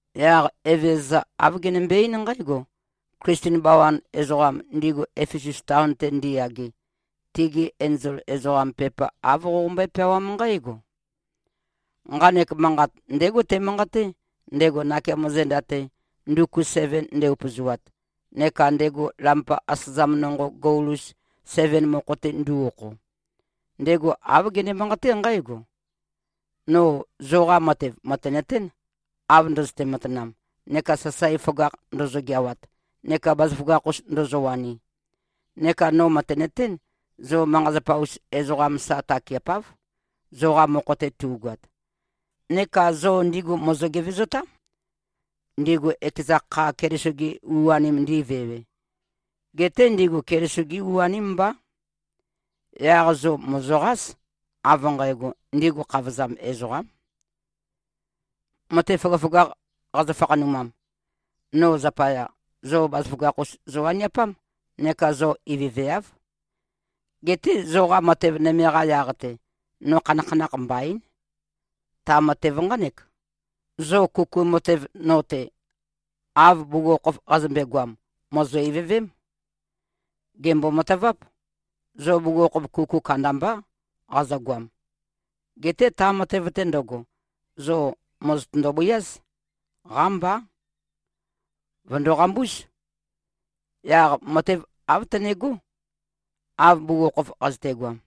Yaq Evezøza, āv genømbe-eín nqǽgo, “Klisten bawan ezoqam, ndigu Efesus taon-te ndiyage, tigi enzol ezoqam, pepa āv qoqombøé-peawám nqǽgo: Nqanek manqat ndégo temanqaté, ndego nakeamo zenda-te, nduku seven nde-upøzoat, neka ndego lampa asøzam nonqo gol-us seven mokho-te ndu꞉-okho. Ndego āv gene-manqaté nqǽgo: No zoqa matev mø̀tenøtén, av ndøzøte-matanam neka sasae føgakh ndozo-geawat neka bazaføgakh-us ndozowani. Neka no mø̀tenøtén, zo manqa-zapa-us ezoqam sa takeapáv, zoqa mokho-te tu꞉goat. Neka zo ndigu mòzo-gevezotám, ndigu ekeza kha Keliso-gi u-anim ndi꞉vewe. Geté ndigu Keliso-gi u-aním mbá. Yaq zo mòzoqás, av nqægo, ndigu khavozam ezoqám. Matev føgøføgakh qazø-fakhanumam, no zapaya, zo bazaføgakh-us zowaniapám. Neka zo ivøveáv. Geté zoqa matev nøme-qa yaq-te, no khanakhanakh mbaín. Ta matev nqánek: Zo kuku matev no-te, av bugukhokhof qazømbe-goam, mòzo-ivøvém. Gèmbo-mataváp: Zo bugukhokhof kuku kandambá qazøgoam. Geté ta matev-te ndøgo, zo mòzotøndo-bøiáz. Qámbá. Vø̀ndo-qambúz. Yaq matev āv tønegó, av bugukhokhof qazøtegoam.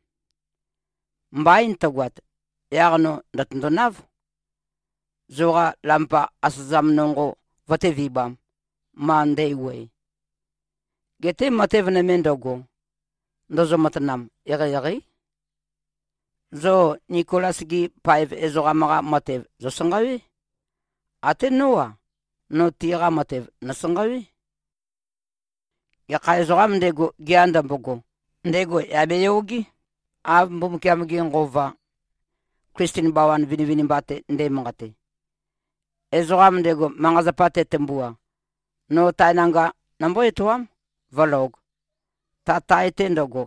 Mbain tøgoat, yaq no ndø̀tøndonáv, zoqa lampa asøzam nonqo vøtévibām, ma ndæwuøe. Geté matev nøme ndøgo, ndozo-matanam, eqeieqeí. Zo Nikolas-gi paev ezoqam-qa matev, zòsanqawé. Até nó-a, no tiqa matev, nòsanqawé. Gekha ezoqām ndego, gea ndømbogo, ndego yà beyogé, av Mbumbukiam-ge Nqova, Klisten bawan vinivinimba-te nde꞉manqate. Ezoqam ndego, manqa-zapa tetømbua, no tae nanga nombó-etoám, vǿlōg, ta tae-te ndøgo,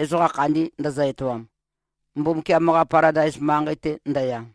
ezoqa khandi ndøzø-etoam, Mbumbukiam-qa Paladais manqei-te ndøya.”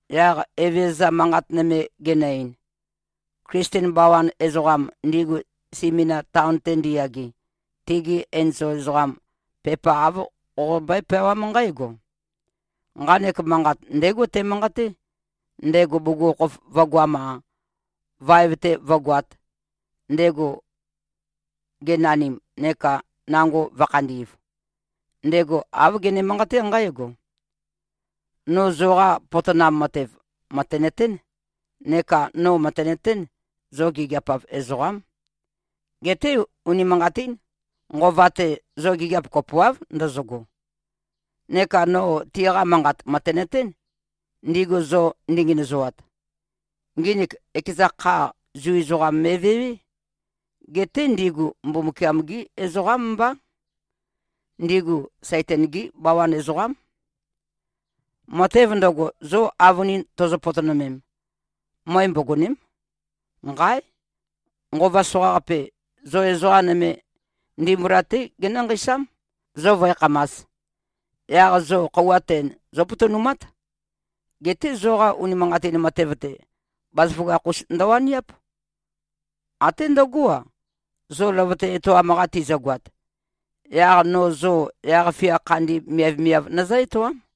Yaq Evezøza manqat nøme genø-ein, “Klisten bawan ezoqam, ndigu Simina taon-te ndiyage, tigi enzol ezoqam, pepa āv qoqombøé-peawám nqǽgo: Nqanek manqat ndégo temanqaté, ndego bugukhokhof vø̄goam-a, vaev-te vǿgoāt, ndego genanim neka nango vø̄khandi꞉v. Ndego āv gene-manqaté nqǽgo: No zoqa potonam matev, mø̀tenøtén. Neka no mø̀tenøtén, zo gigiap-av ezoqám. Geté unimanqatín, nqova-te, zo gigiap kopoáv ndøzøgo. Neka no tiqa manqat mø̀tenøtén, ndigu zo ndingenøzoat. Nginik ekeza kha, Zu ezoqam me꞉vewé. Geté ndigu Mbumbukiam-gí ezoqám mbá. Ndigu Saitan-gí bawan ezoqám. Matev ndøgo, zo avønin tozo-potonømem, møe mbogòne᷄m. Nqáe! Nqova soqaqape, zo ezoqa nøme ndimbula-té genǿ-nqeisám, zo vǿekhamās. Yaq zo khøuwa ten, zópotonumát. Geté zoqa unimanqatin matev-te, bazaføgakh-us ndøwaniáp, até ndøgó-a, zo løvøte etoam-qa tizøgoat. Yaq no zo yaq-fia khandi miavmiav nøzǿ-etoám.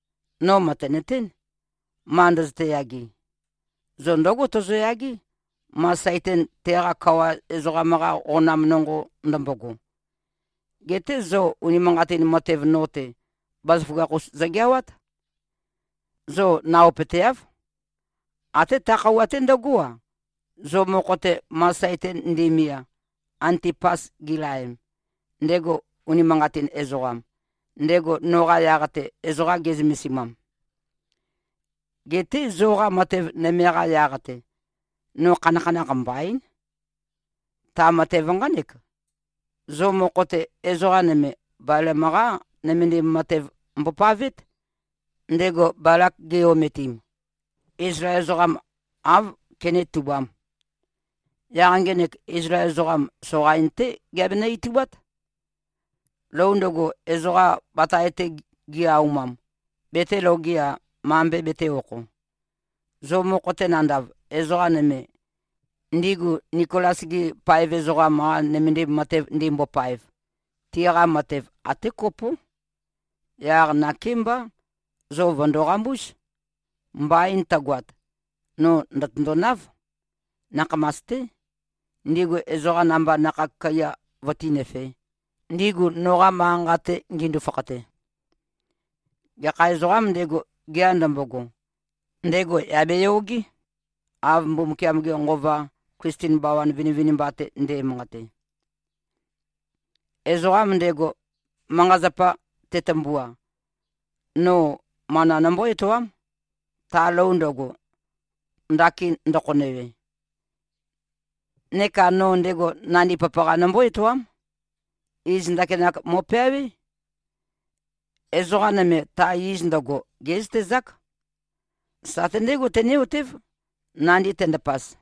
No mø̀tenøtén, ma ndøzøte-yage. Zo ndǿgo tozoyagé, ma Saitan teqa kawa ezoqam-qa qonam nonqo ndømbogo. Geté zo unimanqatin matev no-te, bazaføgakh-us zogeawát. Zo naopøteáv, até ta khøuwa-te ndøgó-a, zo mokho-te, ma Saitan nde꞉mia, Antipas gilaem, ndego unimanqatin ezoqam, ndego noqa yaq-te ezoqa ge꞉zømesimam. Geté zoqa matev nøme-qa yaq-te, no khanakhanakh mbaín. Ta matev nqánek: Zo mokho-te, ezoqa nøme Balam-qá nømendim matev mbopavét, ndego Balak ge꞉-ometim, Izlael ezoqam āv kenétubām. Yaq ngenek, Izlael ezoqam, soqain-té geabenø-itubát. Lou ndøgo, ezoqa batae-te gi-aumam, betēloge-a, mambe betē-okho. Zo mokho-te nandav, ezoqa nøme, ndigu Nikolas-gi paev ezoqam-qa nømendim matev ndimbopaev, tiqa matev até kopó. Yaq nakémbá, zo vø̀ndo-qambúz. Mbain tøgoat, no ndø̀tøndonáv, nakhamas-té, ndigu ezoqa namba nakhag kaiya vøtínøfē, ndigu noqa manqa-nqa-te ngindu-fakhate. Gekha ezoqām ndego, gea ndømbogo, ndego yà beyogé, av Mbumbukiam-ge Nqova, Klisten bawan vinivinimba-te nde꞉manqate. Ezoqam ndego, manqa-zapa tetømbua, no mana nombó-etoám, ta lou ndøgo, ndakin ndøkhonøwe. Neka no ndego nandi papaqa nombó-etoám. Iz ndakinak mo꞉peawé. Ezoqa nøme ta iz ndøgo, gé꞉zøtezák. Sate ndegó tené-otév, nandi tendapaz.”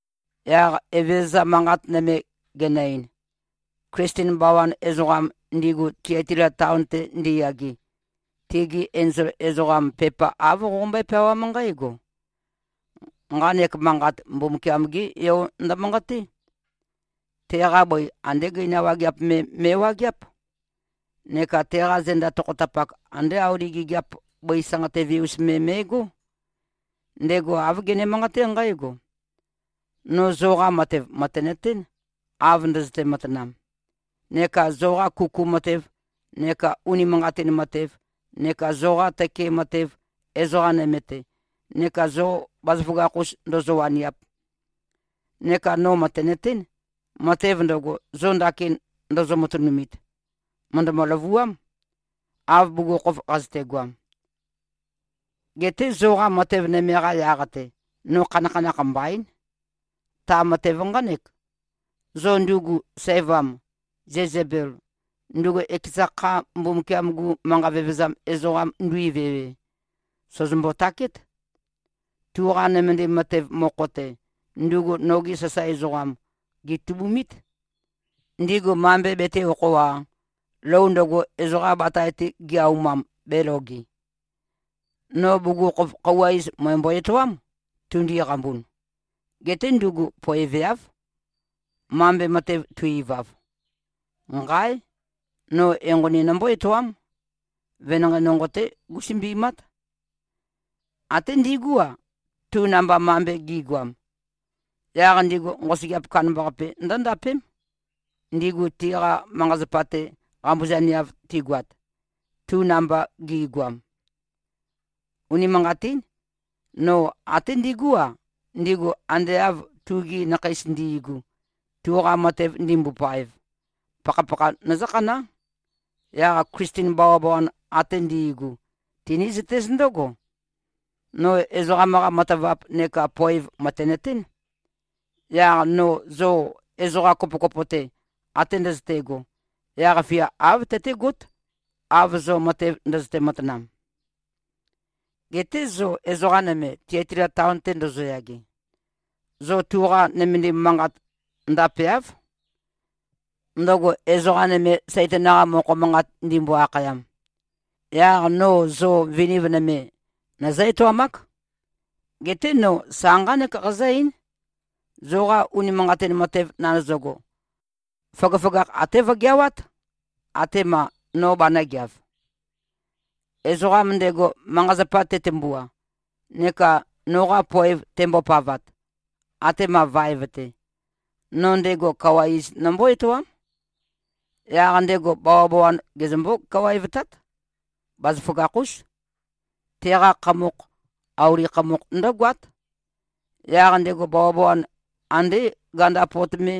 Yaq Evezøza manqat nøme genø-ein, “Klisten bawan ezoqam, ndigu Tiatila taon-te ndiyage, tigi enzol ezoqam, pepa āv qoqombøé-peawám nqǽgo: Nqanek manqat, Mbumbukiam-gé Yo ndømanqaté. Teqa bøi andé gøina wageap me me꞉wageáp. Neka teqa zenda tokhotapak, andé auli gigiap bøi sanqatøve-us me me꞉gó. Ndego āv gene-manqaté nqǽgo: No zoqa matev mø̀tenøtén, av ndøzøte-matanam, neka zoqa kuku matev neka unimanqatin matev neka zoqa tøke matev ezoqa nøme-te neka zo bazaføgakh-us ndozo-waniap. Neka no mø̀tenøtén, matev ndøgo, zo ndakin ndozo-matønumit, mø̀ndømø-løvuám, av bugukhokhof qazøtegoam. Geté zoqa matev nøme-qa yaq-te, no khanakhanakh mbaín. Ta matev nqánek: Zo ndugu sævam, Zezebel, ndugu ekeza kha Mbumbukiam-gu manqa vevezam ezoqam nduivewe, sòzombo-takét. Tuqa nømendim matev mokho-te, ndugu nogi sasae ezoqam, gètubumít. Ndigu mambe betē-okho-a, lou ndøgo, ezoqa batae-te gi-aumam, bēloge. No bugukhokhof, khøuwa iz mø̀embo-etoám, tundui-qambun. Geté ndugu poeveáv, mambe matev tu-ivav. Nqáe! No enqoni nombó-etoám. Venanqei nonqo-té gúsømbimát. Até ndigú-a, tu namba mambe gi꞉goam. Yaq ndigu nqosøgeap kandambaqape ndǿndapém, ndigu tiqa manqa-zapa-te qambuzaneav tigoat, tu namba gi꞉goam. Unimanqatín. No até ndigú-a, ndigu ande av tugi nakheis ndi꞉gu, tuqa matev ndimbopaev, pakhapakha nøzǿkhaná. Yaq Klisten bawabawan ate ndi꞉gu, tinízøtéz ndǿgo: No ezoqam-qa matavap neka poev mø̀tenøtén. Yaq no zo ezoqa kopokopo-te, ate ndøzøte꞉go, yaq-fia āv tøtégót, av zo matev ndøzøte-matanam. Geté zo ezoqa nøme, Tiatila taon-te ndozoyage, zo tuqa nømendim manqat ndapeáv, ndøgo ezoqa nøme, Saitan-qa mokho manqat ndimbo-akhayam. Yaq no zo viniv nøme nøzǿ-etoamák. Geté no sa nqánek qazǿ-eín: Zoqa unimanqatin matev nandøzøgo, føgøføgakh até vøgeawát, atema no banø̄geav. Ezoqam ndego, manqa-zapa tetømbua, neka noqa poev tembopavat, atema vaev-te, no ndego kawa iz nombó-etoám. Yaq ndego bawabawan gezømbó-kawaevtát. Bazaføgakh-ús. Teqa khamokh, auli khamokh ndǿgoát. Yaq ndego bawabawan andé ganda pot me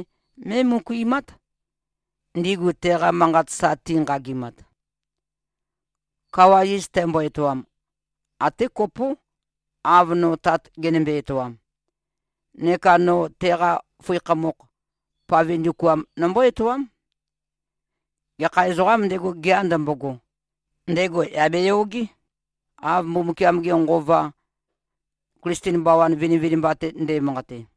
mé꞉møkuimát, ndigu teqa manqat sa tinqagimat. Kawa iz tæmbo-etoam, até kopó, av no Tat genømbe-etoam. Neka no teqa føi khamokh, pave ndukuam nombó-etoám. Gekha ezoqām ndego, gea ndømbogo, ndego yà beyogé, av Mbumbukiam-ge Nqova, Klisten bawan vinivinimba-te nde꞉manqate.”